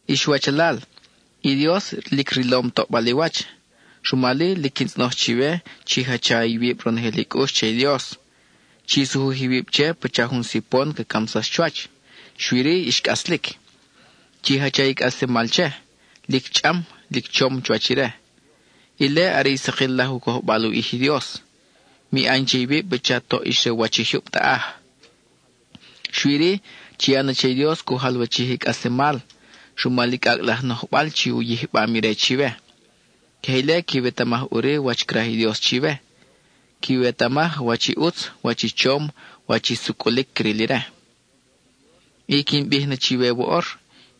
Ix wachalal, i Dios lic rilom toʼbal i wach, rumal-i, lic quin tzʼonoj chiwe chi jacha iwib ronojel i cʼux che i Dios. Chi sujuj iwib che pacha jun sipon ca camsax chuwach, xui-ri, ix cʼaslic. Chi jacha i cʼaslemal che, lic chʼam, lic chom chuwach ire. Ile are sakil laj u cojbal u ʼij i Dios. Mi ʼan che iwib pacha toʼ ix re u wach i jyub taʼaj. Xui-ri, chi ya na che i Dios cu jalwachij i cʼaslemal, rumal i cʼacʼ laj nojbal chi u yijbam ire chiwe. Queje ile quiwetamaj ʼuri wach craj i Dios chiwe; quiwetamaj wach i ʼutz, wach i chom, wach i sucʼulic cril ire. I quin bij na chiwe woʼor,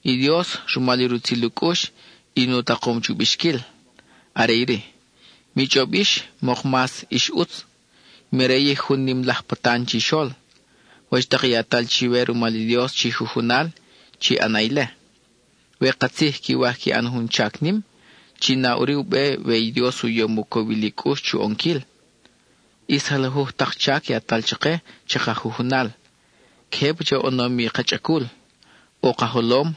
i Dios, rumal i rutzil u cʼux, in u takom chu bixquil; are iri: mi chʼob yix mok mas ix ʼutz (mi rayij jun nim laj patan chixol). Wach tak i yatal chiwe rumal i Dios chi jujunal, chi ʼana ile; we katzij quiwaj qui ʼan jun chac nim, chi na ʼuri u be we i Dios u yom u cowil i cʼux chu ʼonquil. ʼIs jalajuj tak chac yatal chake chaka jujunal, queje pacha u ʼonom i ka chʼacul: ʼo ka jolom,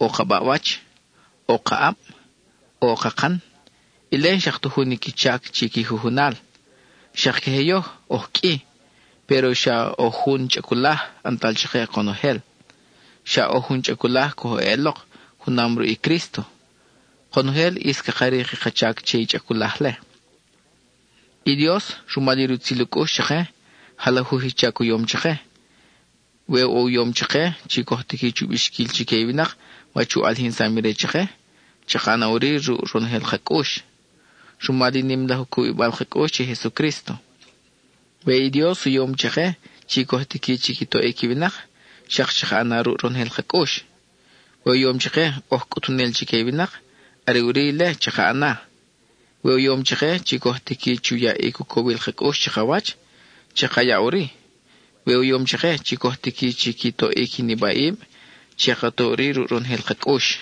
ʼo ka baʼwach, ʼo ka ʼab, ʼo kakan; ile n-xak ta jun i qui chac chi qui jujunal. Xak queje yoj; oj qʼui, péro xa oj jun chʼaculaj ʼantal chake konojel. Xa oj jun chʼaculaj coj eʼelok junam ruʼ i Crísto; konojel ʼis caka rik i ka chac che i chʼaculaj-le. I Dios, rumal i rutzil u cʼux chake, jalajuj i chac u yom chake; we u yom chake chi coj tiqui chu bixquil chique i winak wach u ʼalijinsam ire chake, chaka ʼana ʼuri ruʼ ronojel ka cʼux, rumal i nim laj u cubibal ka cʼux che i Jesucrísto. We i Dios u yom chake chi coj tiqui chi qui toʼic i winak, xak chaka ʼana ruʼ ronojel ka cʼux. We u yom chake oj cʼutunel chique i winak, are ʼuri ile chaka ʼana. We u yom chake chi coj tiqui chu yaʼic u cowil ka cʼux chakawach, chaka ya ʼuri. We u yom chake chi coj tiqui chi qui toʼic i nibaʼib, che ka to ʼuri lic ronojel ka cʼux.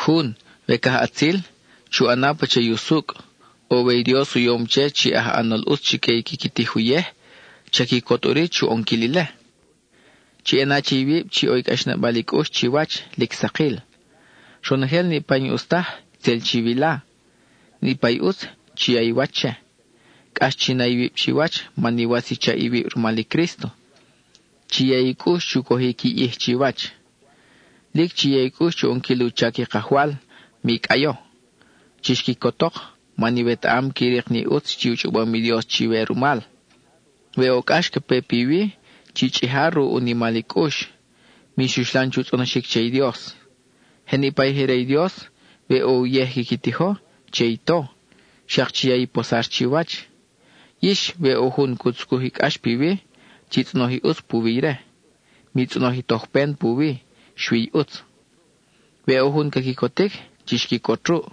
Jun, we cajʼatzil, chu ʼana pacha i usucʼ, o we i Dios u yom che chi aj ʼanol ʼutz chique i quiqui tij uyej, cha quicot ʼuri chu ʼonquil ile. Chi ʼana che iwib chi ʼo cʼaxnabal i cʼux chiwach, lic sakil. Ronojel niʼpa i n-ʼus taj, tzel chiwila; niʼpa i ʼutz, chi ya i wach che. Cʼax chi na iwib chiwach man iwatz i chaʼ iwib rumal i Crísto. Chi ya i cʼux chu cojic i ʼij chiwach. Lic chi ya i cʼux chu ʼonquil u chac i Kajwal; mi cʼayo. Chix quicotok, man iwetaʼam qui rik ni ʼutz chi u chʼobom i Dios chiwe rumal. We ʼo cʼax ca pe piwi, chi chʼija ruʼ u nimal i cʼux. Mix uxlan chu tzʼonoxic che i Dios. Je niʼpa i je re i Dios, we ʼo uyej quiqui tijo, che i to; xak chi ya i posar chiwach. Yix, we ʼo jun cu tzucuj i cʼax piwi, chi tzʼonoj i ʼutz puwi ire. Mi tzʼonoj i tojpen puwi, xui i ʼutz. We ʼo jun ca quicotic, chix quicot ruʼ;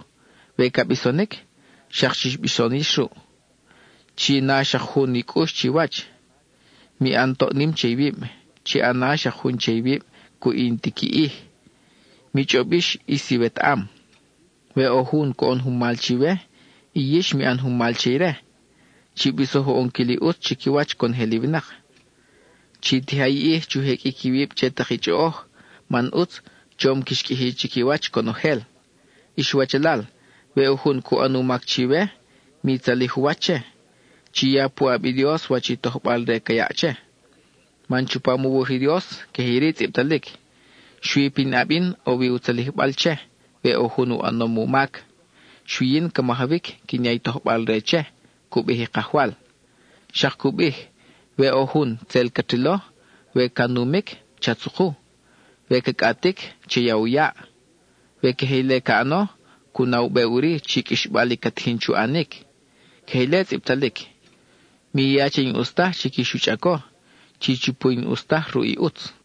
we ca bisonic, xak chix bison yix ruʼ. Chi na xak jun i cʼux chiwach. Mi ʼan toʼ nim che iwib; chi ʼana xak jun che iwib cuʼ i n-ti qui ʼij. Mi chʼob yix ʼis iwetaʼam. We ʼo jun coʼon jun mal chiwe, i yix mi ʼan jun mal che ire. Chi bisoj u ʼonquil i ʼutz chiquiwach conojel i winak. Chi tija i ʼij chu jeqʼuic iwib che tak i chʼoʼoj, man ʼutz, chom quix qʼuiji chiquiwach conojel. Ix wachalal, we ʼo jun cu ʼan u mac chiwe, mi tzalij u wach che. Chi ya puʼab i Dios wach i tojbal-re ca yaʼ che. Man chupam u wuj i Dios, queje iri tzʼibtalic: “Xui pinʼab yin ʼo wi u tzalijbal che, we ʼo jun u ʼanom u mac; xui yin ca majawic quin ya i tojbal-re che, cu bij i Kajwal.” Xak cu bij: “We ʼo jun, tzel cat rilo, we ca numic, cha tzuku; we ca cʼatic, cha ya u yaʼ. We queje ile ca ʼano, cu na u be ʼuri chi qʼuixbal i ca tijin chu ʼanic.” (Queje ile tzʼibtalic.) Mi ya che i n-ʼus taj quix u chʼaco; chi chupu i n-ʼus taj ruʼ i ʼutz.